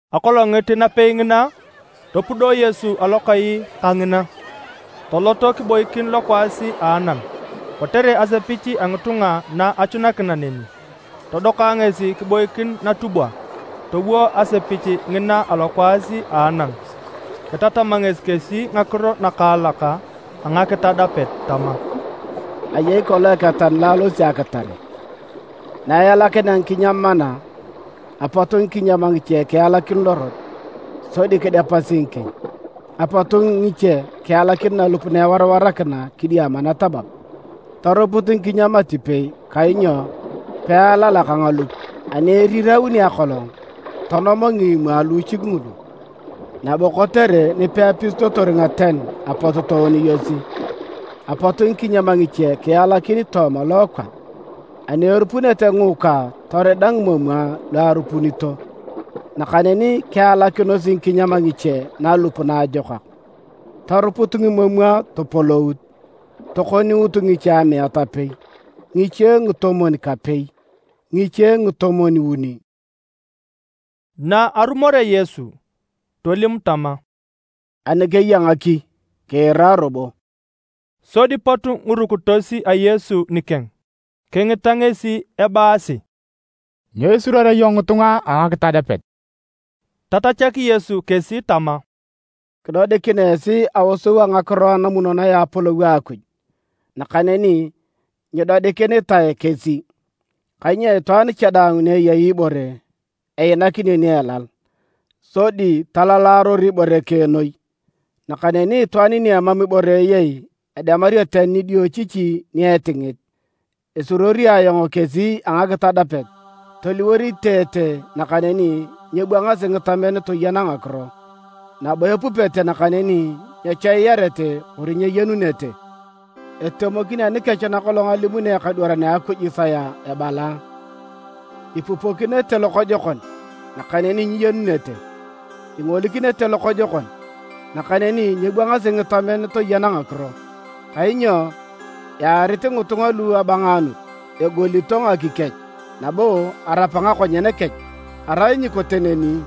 Akolonngit napei ngina topudo Yesu alokai kangina, tolot kiboikin lokwaas a anam. Kotere asepich a ngitunga na achunakina neni, todoka ngesi kiboikin natubwa, towo asepich ngina alokwaas a anam. Kitatam ngesi kesi ngakiro nakaalak a ngakitadapet tama, “Ayei kolong eketan lo alosi akitare. Na ealakinea ngikinyam mana, apot ngikinyam ngiche kialakin lorot, sodi kidepasi ngikieny. Apot ngiche kialakin nalup na ewarawarakina kidiama natabab. Toruput ngikinyam atipei kainyo pealalak ngalup. Ani erirauni akolong, tonom ngimomwa luuchik ngulu, nabo kotere nipeapisitotor ngaten apot tooniyosi. Apot ngikinyam ngiche kialakin tooma lookwa. Ani erupunete ngiikwa torida ngimomwa lu arupunito. Nakaneni kialakinos ngikinyam ngiche nalup naajokak, toruput ngimomwa topolout, tokoniut ngiche amiat apei, ngiche ngitomwon-kapei, ngiche ngitomwon-uni.” Na arumorea Yesu, tolim tama, “Ani keya ngaki kiira robo.” Sodi pot ngirukitos a Yesu nikeng kingita ngesi ebaasi, “Nyo isuruorea iyong ngitunga a ngakitadapet?” Tatachak Yesu kesi tama, “Kidodikin esi aosou a ngakiro a namunonoe a Apolou a Akuj, nakaneni nyidodikinitae kesi. Kainyo itwaan cha daang ni eyei ibore, einakinio ni elal, sodi talalaror ibore keng noi. Nakaneni itwaan ni emam ibore eyei, edemario tani nidiochichi ni etingit. Esuruori ayong kesi a ngakitadapet, toliwor iteete nakaneni nyebwangasi ngitamen toyena ngakiro, nabo epupete nakaneni nyechoiyarete kori nyeyenunete. Etemokin anikech nakolong alimuni ekadwaran a Akuj Isaya ebala: ‘Ipupokinete lokojokon, nakaneni nyiyenunete. Ingolikinete lokojokon, nakaneni nyebwangasi ngitamen toyena ngakiro. Kainyo earit ngitunga lu abangaanut. Egolito ngaki kech, nabo arapa ngakonyen kech. Arai nyikote neni,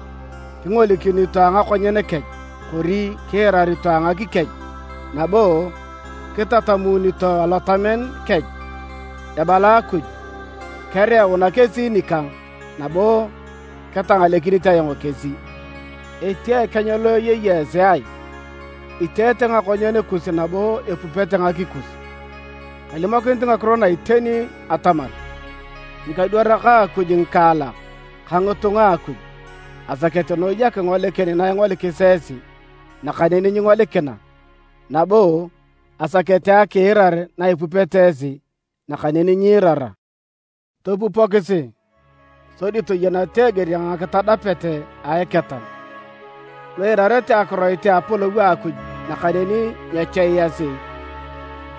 kingolikinito a ngakonyen kech. Kori kiirarito a ngaki kech, nabo kitamunito alotamen kech. Ebala Akuj, kereuna kesi nikang, nabo ketangalekinit ayong kesi’. “Etia ekeny lo eyei esi ai? Iteete ngakonyen kus nabo epupete ngaki kus. Kalimokinit ngakiro na iteni atamar ngikadwarak a Akuj ngikaalak ka ngitunga a Akuj, asakete noi akingolikin na ingolikis esi, nakaneni nyingolikina, nabo asakete akiirar na ipupete esi, nakaneni nyiirara. “Topupokisi, sodi toyeneta eger a ngakitadapet a eketan. Lu iirarete akiroit a Apolou a Akuj nakaneni nyechoiyasi,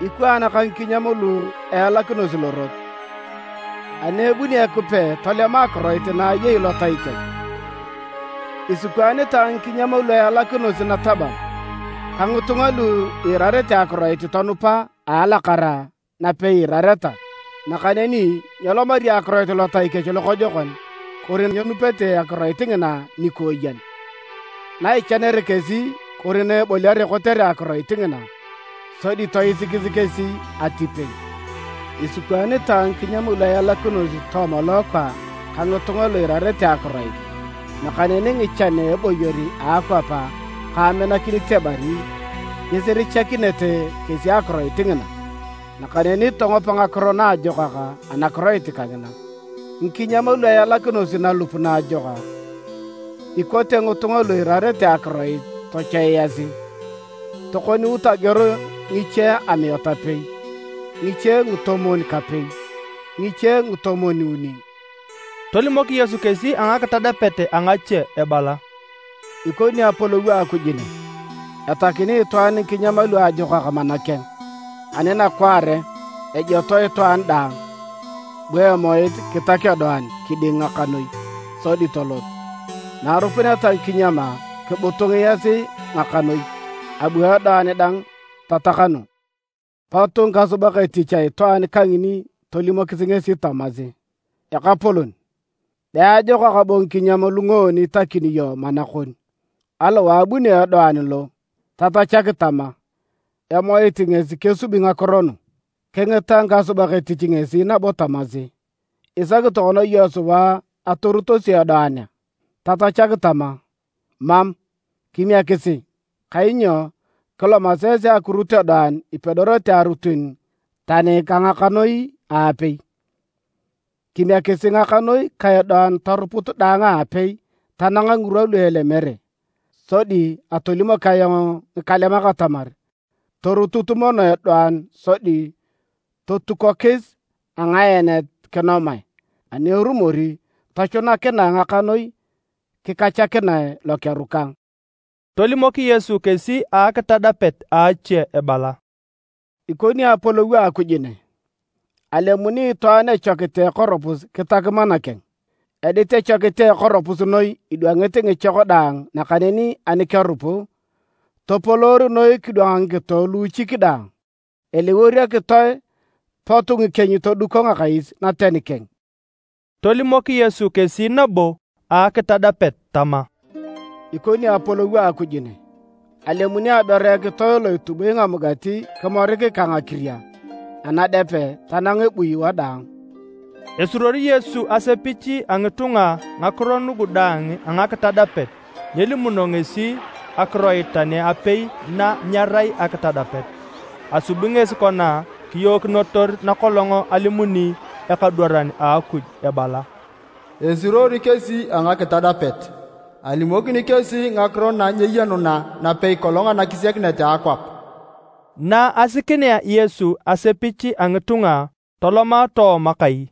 ikwaan ka ngikinyam lu ealakinosi lorot. Ani ebuni Ekipe tolema akiroit na eyei lotai kech. Isikwaanitae ngikinyam lu ealakinosi natabab, ka ngitunga lu iirarete akiroit tonupa a alakara napei iirareta. Nakaneni nyelomari akiroit lotai kech lokojokon kori nyenupete akiroit ngina nikooyen. Na ichanere kesi kori na eboliare kotere akiroit ngina, sodi toisikis kesi atipei. Isikwaanitae ngikinyam lu ealakinosi tooma lookwa ka ngitunga lu iirarete akiroit, nakaneni ngichan a eboyor a akwap ka aminakinit ebari, nyisirichakinete kesi akiroit ngina, nakaneni tongopa ngakiro naajokak anakiroit kangina. Ngikinyam lu ealakinosi nalup naajokak, ikote ngitunga lu iirarete akiroit tochoiasi, tokoniut ageor ngiche amiat apei, ngiche ngatomwon-kapei, ngiche ngatomwon-uni.” Tolimok Yesu kesi ngakitadapet ngache ebala, “Ikoni Apolou a Akuj ne. Etakini itwaan ngikinyam luajokak mana keng. Ani nakwaare, ejotoe itwaan daang, bu emoit kitak edoan kiding ngakanoi, sodi tolot. Na arupuneta ngikinyam kibutungiasi ngakanoi, abu edoan dang tatakanu. Pot ngikasubak etich a itwaan kangini tolimokis ngesi tamasi: ‘Ekapolon, be ajokak bo ngikinyam lu ngoon itakini iyong mana kon, aliwae abunio edoan lo?’ Tatachak tama: ‘Emoit ngesi kesubi ngakiro nu.’ Kingita ngikasubak etich ngesi nabo tamasi, ‘Isaki tokona iyong sua atorutosi edoan a?’ Tatachak tama, ‘Mam, kimiekisi, kainyo kilomasi esi akirut edoan ipedorete arutun tani ka ngakanoi aapei. Kimiekisi ngakanoi ka edoan toruput daang aapei tanang ngirwa lu elemere. Sodi atolimok ayong ngikalemak atamar, torutut mono edoan sodi totukonokis a ngaenet kinomae, ani erumor tochunakinae ngakanoi kikachakinae lokeru kang.’” Tolimok Yesu kesi akitadapet ache ebala, “Ikoni Apolou a Akuj ne. Alemuni itwaan echokit a ekoropus kitak mana keng. Edit echokit a ekoropus noi idwangit ngichok daang nakaneni ani kerupu, topoloor noi kidwang ngikito luuchik daang. Eliwor ekitoe pot ngikieny toduko ngakais naten keng.” Tolimok Yesu kesi nabo akitadapet tama, “Ikoni Apolou a Akuj ne. Alemuni aberu ekitoe lo itubui ngamugati kimorik ka ngakiria anadepe tanang ebui wadaang.” Esuruori Yesu asepich a ngitunga ngakiro nugu daang a ngakitadapet nyelimuno ngesi akiroit tani apei na nyerai ngakitadapet. Asubi ngesi kona kiyookinotor nakolong alimuni ekadwaran a Akuj ebala: “Esuruori kesi a ngakitadapet. Alimokini kesi ngakiro na nyeyenuna napei kolong anakisiakinet a akwap.” Na asikinea Yesu asepich a ngitunga toloma tooma kai,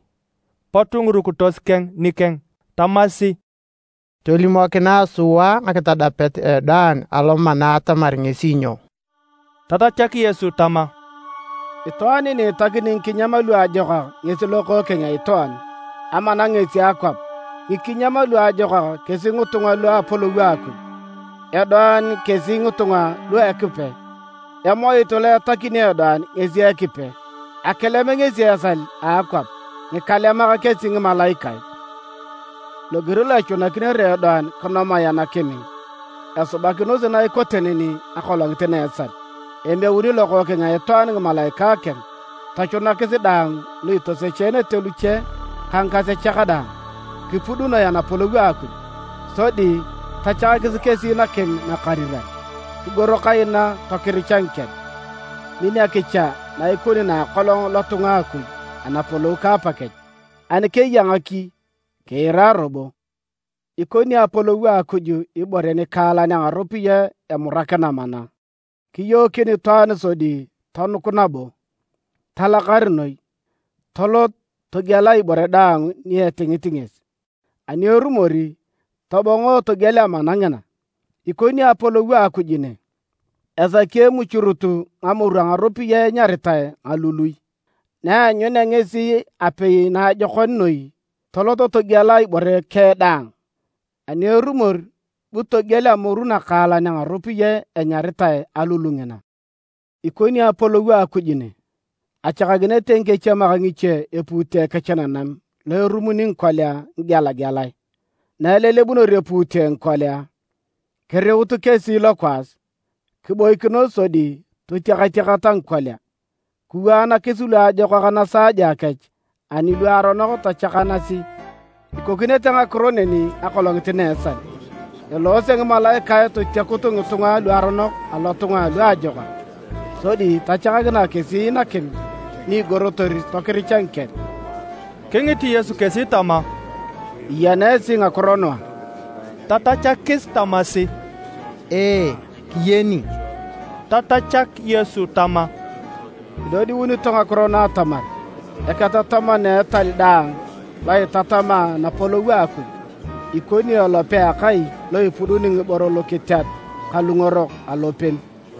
pot ngirukitos keng nikeng tamasi, “Tolimokinae sua ngakitadapet a edoan alomana atamar ngesi nyo.” Tatachak Yesu tama, “Itwaan ni etakini ngikinyam luajokak ngesi Lokookeng a Itwaan. Amana ngesi akwap. Ngikinyam luajokak kesi ngitunga lu a Apolou a Akuj. Edoan kesi ngitunga lu a Ekipe. Emoit lo etakini edoan ngesi Ekipe. Akilem ngesi esal a akwap. Ngikalemak kesi ngimalaikae. Loger lo echunakinere edoan kinomae anakim, esubakinosi na ikote neni akolongit na a esal. Emeuni Lokookeng a Itwaan ngimalaikae keng tochunakis daang lu itosechenete luche ka ngikasechak daang, kipudunoe Anapolou a Akuj. Sodi tachakakis kesi nakim nakariran, kigoro kaina tokiricha ngikel. Min akicha na ikoni na akolong lotunga a Akuj Anapolou ka Apakech. Ani keya ngaki, kiira robo! “Ikoni Apolou a Akuj ibore nikaalan a ngaropiyae emurakina mana. Kiyookin itwaan sodi tonuk nabo. Talakar noi, tolot, togiela ibore daang ni etingit ngesi. Ani erumor, tobongo togiel amana ngina. “Ikoni Apolou a Akuj ne. Esaki emuchurut ngamoru a ngaropiyae enyaritae ngalului. Na eanyunea ngesi apei naajokon noi, tolot, togiela ibore keng daang. Ani erumor bu togiel amoru nakaalan a ngaropiyae enyaritae alulu ngina. “Ikoni nabo Apolou a Akuj ne. Achakakinete ngikechiemak ngiche epuute kech nanam lo erumuni ngikolia ngigelagelae. Na ilelebunor epuute ngikolia, kiriut kesi lokwaas, kiboikinos sodi totiakatiakata ngikolia. Kiwaanakis luajokak nasaaja kech ani luaronok tochakanasi. Ikokinete ngakiro neni akolongit na a esal. Eloose ngimalaikae totiakut ngitunga luaronok alotunga alu ajokak sodi tachakakinae kesi nakim ni igorotor tokiricha ngikel.” Kingit Yesu kesi tama, “Iyena esi ngakiro nu a?” Tatachakis tamasi, “Ee, kiyen.” Tatachak Yesu tama, “Idodiunito ngakiro nu atamar, eketataman a etal daang lo itatama Anapolou a Akuj, ikoni elope a akai lo ipuduni ngiboro lukiteat ka lungorok alopem.”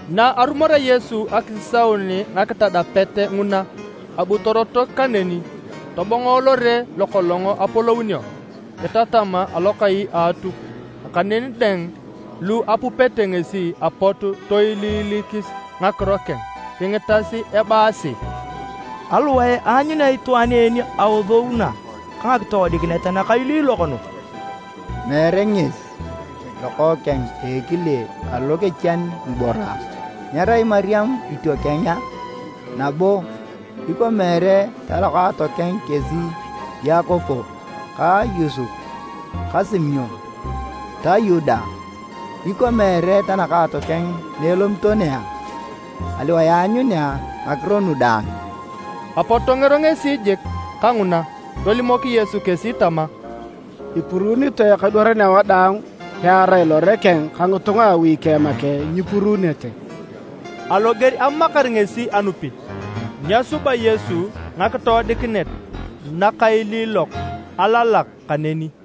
Na arumorea Yesu akisisaun ngakitadapet nguna, abu torotok kaneni, tobongo lore lokolong apolounio. Kitatam alokai a Atuk, nakaneni daang lu apupete ngesi apot toiliilikis ngakiro keng. Kingitas ebaasi, “Aliwae aanyunea itwaan en aosou na ka ngakitoodikinet nakailiilok nu? Meere ngesi lokookeng a ekile alo kechian ngiboro a? Nyerai Mariam itiokeng a? Nabo ikwa meere talokaatokeng kesi Yakobo ka Yosep ka Simon ta Yuda a? Ikwa meere tanakaatokeng na elomito ne a? Aliwae aanyunea ngakiro nu daang?” Apot tongero ngesi jik kanguna. Tolimok Yesu kesi tama, “Ipuruunitoe ekadwaran awadaang pearai lore keng ka ngitunga a awi keng make nyipuruunete.” Aloger amamakar kesi anupit, nyesuba Yesu ngakitoodikinet nakailiilok alalak kaneni.